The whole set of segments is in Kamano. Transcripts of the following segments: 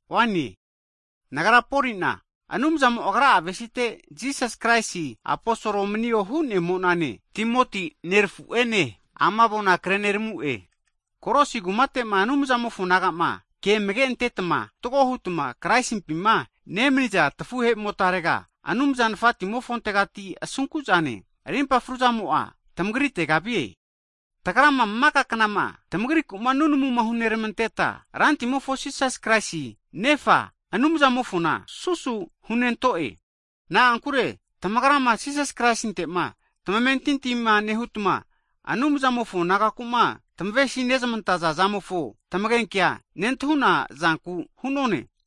Hagi nagra Poli'na, Anumzamo Agra'a avesizante Jisas Kraisi aposol manio hu'nemo'nane, Timoti nerafu'ene ama avona kreneramu'e. Kolosi kumate'ma Anumzamofo nagama, ke amage'antetma fatgo hutma Kraisimpima nemaniza tafuhe'motarega, Anumza Nafatimofontegati asunku'zane, rimpa fruzamo'a tamagritega vie. Hagi tagrama maka knama tamagriku'ma nunamu hunermanteta, Rantimofo Jisas Kraisi Nefa Anumzamofona susu hunento'e. Na'ankure tamagrama Jisas Kraisinte'ma tamentintima nehutma, Anumzamofo nagaku'ma tamavesi nezmantaza zamofo tamagenke nentahuna zanku hu'none.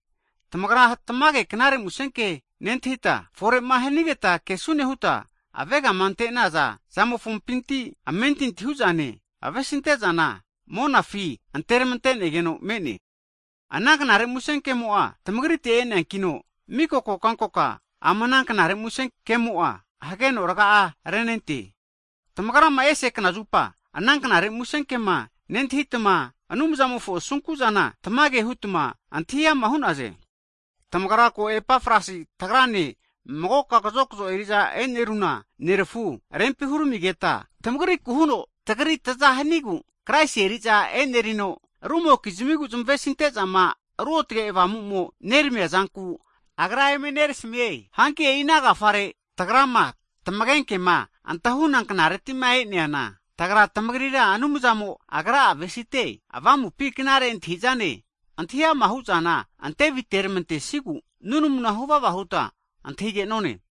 Tagrama tamage Knare Musenke nentahita, fore'ma hanigeta kesune huta avegama ante'naza zamofompinti, amentinti hu'zane, avesinte'zana monafi anteramantegeno me'ne. Ana Knare Musenkemo'a tamagrite e'neankino, miko kokankoka ama ana Knare Musenkemo'a hageno raga'a renente. Tamagrama ese knazupa ana Knare Musenkema nentahitma, Anumzamofo asunkuzana tamage hutma antahi ama hu'naze. Tamagra ko Epafras tagrane magoka kazokzo eriza eneruna nerafu rempi huramimigeta antahi'naze. Tamagriku huno tagrira tazahanigu Kraisi eriza enerino, rumokizmigu zmavesintezama Ruotage Avamumo'ma neramamia zanku agra eme nerasamie. Hanki e'iana agafare, tagrama tamagenkema antahuna knaretima e'neana, tagra tamagrira Anumzamo Agra'a avesite avamupi knare antahi'zane, antahi ama hu'zana antevitermantesiegu nunamuna huvava huta antahi'negone.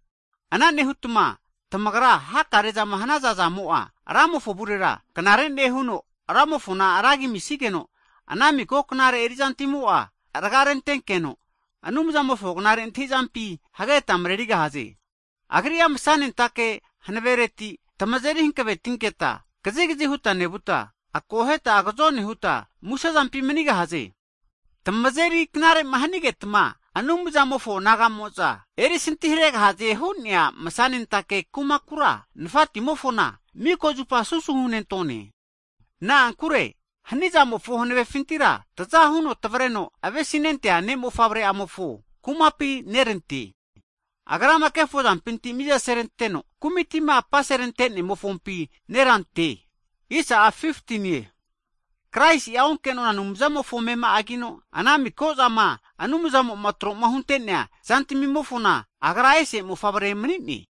Ana nehutma tamagra hakare'zama hanaza zamo'a, Ramofo avurera knare nehuno, Ramofona ragi amisageno, ana miko knare erizantimo'a raga renentenkeno, Anumzamofo knare antahizampi hageta marerigahaze. Agri'a masanentake hankavereti tamazeri hankavetinketa kazikazi huta nevuta, akoheta agazone huta musezampi manigahaze. Tamazeri knarema hanigetma Anumzamofo naga'mo'za erisintiharegahaze hu'nea masanentake kumakura, Nafatimofona miko zupa susu hunentone. Na'ankure hanizamfo hanavefintira taza huno tavreno avesinentea Ne' Mofavre'amofo kumapi tante'ne. Agrama kefozampinti mizaseranteno, kumitima apaserante ne'mofompi tante'ne. Hagi Kraisi'a onkenona Anumzamofo amema'agino, ana miko'zama Anumzamo'ma tro hunte'nea zantamimofona Agra ese mofavre mani'ne.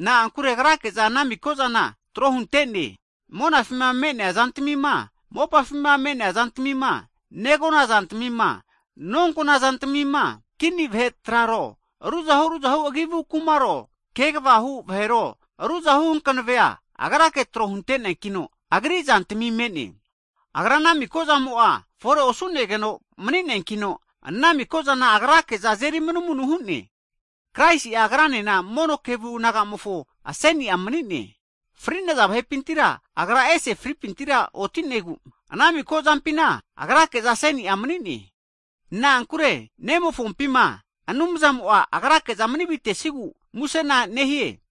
Na'ankure Agrake'za anamiko zana tro huntene, monafima me'nea zantamima, mopafima me'nea zantamima, negona zantamima, nonkona zantamima, kini vahe traro, ruzahu ruzahu kumaro, kegavahu vahero ruzahu hankavea, Agrake tro hunte'neakino Agri zantami me'ne. Agra ana miko'zamo'a fore osu'negeno mani'neankino, ana mikozana Agrake'za azeri manumanu hu'ne. Kraisi'a mono kevu naga'mofo aseni'a mani'ne. Fri'naza vahepintira Agra esera fripintira oti'negu, ana miko zampina Agrake aseni'a mani'ne. Na'ankure Nemofompima Anumzamo'a Agra'a manivitesigu musena nehie.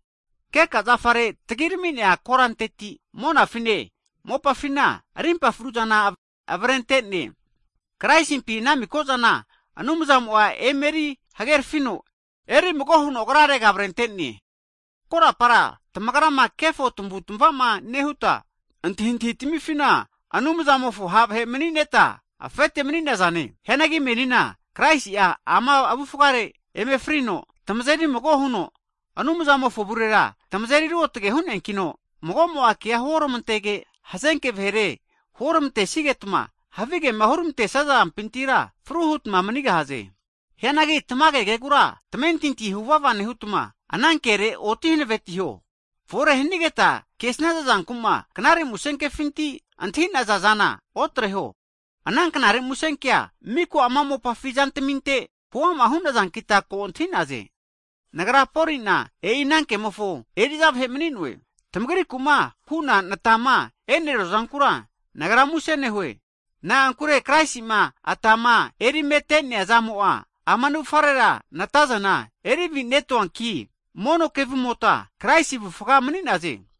Keka zafare tagirami'nea koranteti, monafine mopafina rimpa fruzana avrenteno, Kraisimpi ana mikozana Anumzamo'a emeri hagerafino, erimago huno Agrarega avrentene. Hagi korapara tamagrama kefo tamavutmavama nehuta, antahintahi tamifina Anumzamofo ha' vahe'ma manineta afete mani'nazane. Hianagi menina Kraisi'a ama avufgare eme frino, tamazeri mago huno Anumzamofo avurera tamazeri ruotge hu'neankino, magomo'a kea huoramantege, hazenke vahere huoramantesigetma, havigema huramante zampintira fru hutma manigahaze. Hianagi tamage kegura tamamentinti huvava nehutma, anankere oti hanavetiho. Fore hanigeta kesnaza zanku'ma Knare Musenkefinti'ma antahi'naza zana otreho. Ana Knare Musenkea miko ama mopafi zantaminte huama hu'nazankita ko antahinaze. Nagra Polina e'i anankemofo eri'za vahe mani'noe. Tamagriku'ma hu'na natama e'neruazankura nagra muse nehue. Na'ankure Kraisi'ma atama erimete'nea zamo'a ama navufarera natazana erivinetoankita, mono kevumotma, Kraisi avufga mani'naze.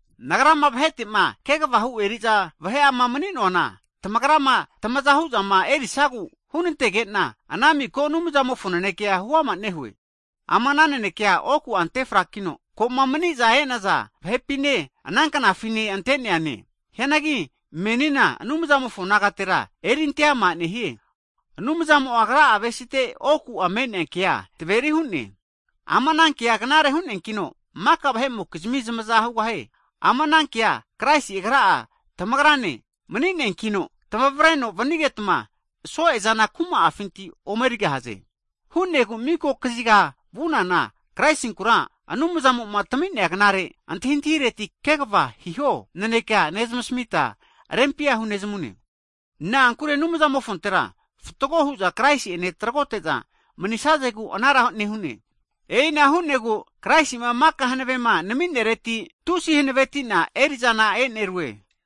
Nagrama vahetema kegavahu eri'za vahe'ama mani'noana, tamagrama tamaza hu'zama erisagu hunantege'na, ana miko Anumzamofo nanekea huama nehue. Ama ana nanekea oku'a ante frakino koma maniza e'naza vahepine, ana knafine anteneane. Hianagi menina Anumzamofo nagatera eri ante'ama nehie. Anumzamo'a Agra'a avesite oku'a me'nea kea taveri hu'ne. Ama ana kea knare hu'neankino, maka vahe'mokizmi zamaza hugahie. Ama ana kea Kraisi'a agra tamagrane mani'neankino tamavreno vanigetma so'ezana kuma'afinti ome erigahaze. Hu'negu miko kazigama vunana Kraisinkura, Anumzamo'ma tami'nea knare antahintahireti kegava hiho nanekea nezmasamita rempia hunezamune. Na'ankure Anumzamofontera fatgo hu'za Kraisi'ene tragote'za manisazegu anara nehu'ne. E'ina hu'negu Kraisima maka hankavema naminereti tusi hankavetina eri'zana e'nerue.